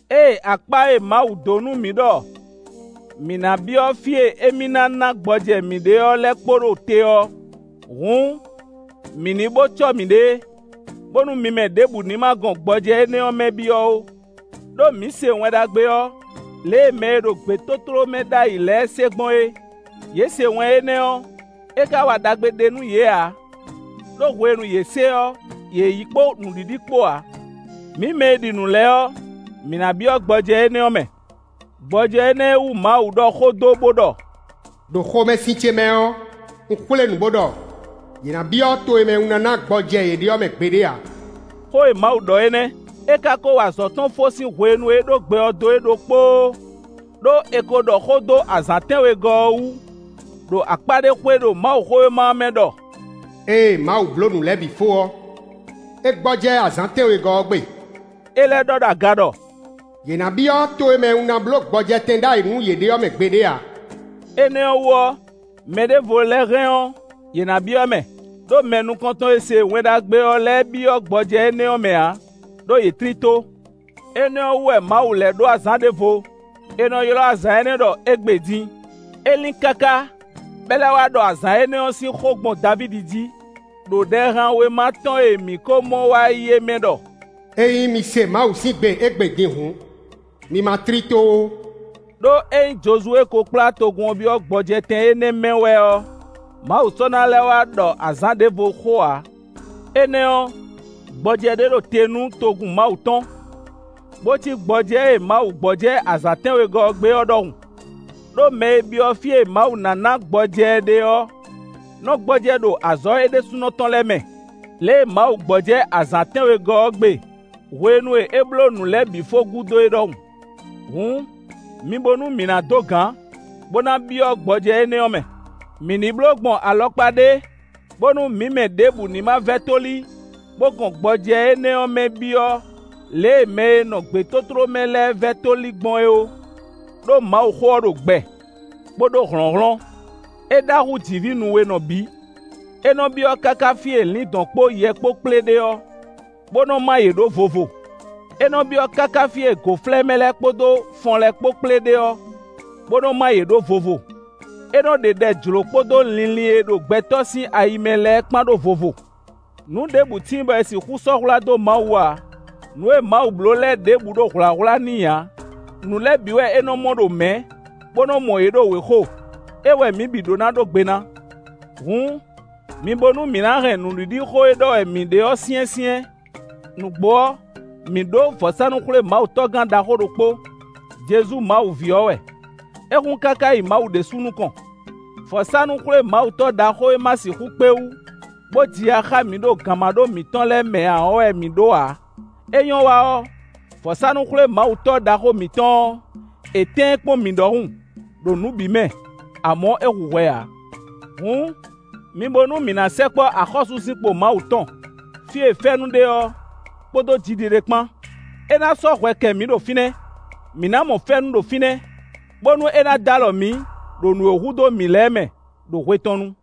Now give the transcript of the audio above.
Ée akpá e Mawu dó nú mǐ ɖɔ mǐ ná byɔ́ fí e émí ná ná gbɔjɛ́ mǐ ɖe ɔ́ lɛ́ kpo ɖo te ɔ́, hǔn mǐ ní bó cɔ́ mǐɖée, bónú mi mɛ ɖěbǔ ní ma gɔn gbɔjɛ́ énɛ́ ɔ́ mɛ byɔ́ ó. Đó mǐ se Wɛn Ɖagbe ɔ́ lě e mɛ e ɖo gbětótló mɛ ɖ'ayǐ lɛ́ɛ se gbɔn é. Yě se wɛn énɛ́ ɔ́; é ka wa ɖagbe ɖé nú yě ǎ; ɖó hwenu e yě se ɔ́, yě yí kpó nǔɖiɖi kpó ǎ. Mǐ mɛ e ɖi nǔ lɛ́ɛ ɔ́, mǐ ná byɔ́ gbɔjɛ́ énɛ́ ɔ́ mɛ; gbɔjɛ́ énɛ́ e wú Mawu ɖɔ xó dó bó ɖɔ: “Đo xomɛsin ce mɛ ɔ́, un xwlé nǔ bó ɖɔ: ‘Yě ná byɔ́ to e mɛ un ná ná gbɔjɛ́ yě ɖe ɔ́ mɛ gbeɖé ǎ.’” Xó e Mawu ɖɔ é nɛ́; é ká kó wa azɔ̌ tɔn fó sín hwenu e é ko ɖó gbɛ ɔ́ dó é ɖokpóó. Đó è ko ɖɔ xó dó azǎn tɛ́nwegɔ́ ɔ́ wú, ɖo akpá ɖé xwé ɖo Mawuxówéma ɔ́ mɛ ɖɔ: “Ée Mawu bló nǔ lɛ́ɛ bǐ fó ɔ́, é gbɔjɛ́ azǎn tɛ́nwegɔ́ ɔ́ gbe.” É lɛ́ ɖɔ ɖo aga ɖɔ: “Yě ná byɔ́ to e mɛ un bló gbɔjɛtɛn ɖ'ayǐ nú yě ɖe ɔ́ mɛ gbeɖé ǎ.” Énɛ́ ɔ́ wú ɔ́, mɛ ɖěvo lɛ́ɛ hɛn ɔ́, yě ná byɔ́ mɛ, ɖó mɛ nukɔntɔn e se Wɛn Ɖagbe ɔ́ lɛ́ɛ byɔ́ gbɔjɛ́ énɛ́ mɛ ǎ, ɖó yě tlí tó. Énɛ́ ɔ́ wú wɛ Mawu lɛ́ ɖó azǎn ɖěvo; è nɔ ylɔ́ azǎn énɛ́ ɖɔ “Égbé din”. É lín káká, bɔ é lɛ́ wá ɖɔ azǎn énɛ́ sín xó gbɔn Davídi jí, ɖo Ɖɛhanwéma tɔn e mǐ ko mɔ wá yi é mɛ ɖɔ: “Ényí mi se Mawu sín gbe égbé din hǔn, mi ma tlí tó ó.” Đó ényí Jozuwée ko kplá togun ɔ́ byɔ́ gbɔjɛtɛn énɛ́ mɛ wɛ ɔ́, Mawu sɔ́ ná lɛ́ wá ɖɔ azǎn ɖěvo xó ǎ. Énɛ́ ɔ́, gbɔjɛ́ ɖé ɖo te nú togun Mawu tɔn, bó cí gbɔjɛ́ e Mawu gbɔjɛ́ azǎn tɛ́nwegɔ́ ɔ́ gbe ɔ́ ɖɔhun. Đó mɛ e byɔ́ fí e Mawu ná ná gbɔjɛ́ ɛ ɖe ɔ́, nɔ gbɔjɛ́ ɖo azɔ̌ é ɖésúnɔ tɔn lɛ́ɛ mɛ lě e Mawu gbɔjɛ́ azǎn tɛ́nwegɔ́ ɔ́ gbe hwenu e é bló nǔ lɛ́ɛ bǐ fó gúdo é ɖɔhun. Hǔn, mi bo nú mǐ ná dó gǎn, bó ná byɔ́ gbɔjɛ́ énɛ́ ɔ́ mɛ; mǐ ní bló gbɔn alɔkpa ɖé bónú mǐ mɛ ɖěbǔ ní ma vɛ́ tóli bó gɔn gbɔjɛ́ énɛ́ ɔ́ mɛ byɔ́ lě e mɛ e nɔ gbětótló mɛ lɛ́ɛ vɛ́ tóli gbɔn é ó. Đó Mawuxó ɔ́ ɖo gbɛ, bó ɖó hlɔ̌nhlɔ́n; é ɖá hú jǐví nuwenɔ bǐ. É nɔ byɔ́ káká fí e lǐndɔ̌n kpó yɛ kpó kplé ɖe ɔ́, bó nɔ má yě ɖó vovo. É nɔ byɔ́ káká fí e gǒflɛ́mɛ lɛ́ɛ kpódó fɔn lɛ́ɛ kpó kplé ɖe ɔ́, bó nɔ má yě ɖó vovo. É nɔ ɖe ɖɛ jlǒ kpódó linlin e ɖo gbɛtɔ́ sín ayi mɛ lɛ́ɛ kpán ɖó vovo. Nǔ ɖěbǔ tíin bɔ è sixú sɔ́ hwlá dó Mawu ǎ. Nǔ e Mawu bló lɛ́ɛ ɖěbǔ ɖo hwlǎhwlá n'i ǎ; nǔ lɛ́ɛ bǐ wɛ é nɔ mɔ ɖo mɛ̌, bó nɔ mɔ yě ɖo wěxo; é wɛ mǐ bǐ ɖó ná ɖó gbe ná. Hǔn, mi bo nú mǐ ná hɛn nǔɖiɖixó e ɖɔ wɛ mǐ ɖe ɔ́ syɛ́nsyɛ́n. Nǔgbó ɔ́, mǐ ɖó vɔ̌sánú-xwlémawutɔ́gán ɖaxó ɖokpó; Jezu Mawu ví ɔ́ wɛ; é hun káká yi Mawu ɖésú nukɔn. Vɔ̌sánú-xwlémawutɔ́ ɖaxó e ma sixú kpé wú bó ji ya xá mǐ ɖo gǎnmaɖó mǐtɔn lɛ́ɛ mɛ ǎ ɔ́ wɛ mǐ ɖó ǎ. É nyɔ́ wa ɔ́, vɔ̌sánú-xwlémawutɔ́ ɖaxó mǐtɔn ɔ́, è tɛ́n ɛ kpɔ́n mǐ ɖɔhun ɖo nǔ bǐ mɛ; amɔ̌, é hu hwɛ ǎ. Hǔn, mi bo nú mǐ ná sɛkpɔ́ axɔ́súzinkpo Mawu tɔn, fí e fɛ́nú ɖe ɔ́, kpódó jiɖiɖe kpán; é ná sɔ́ hwɛ kɛ mǐ ɖo fínɛ́. Mǐ ná mɔ fɛ́nú ɖo fínɛ́, bónú é ná d'alɔ mǐ ɖo nǔ e hudó mǐ lɛ́ɛ mɛ, ɖo hwe tɔn nu.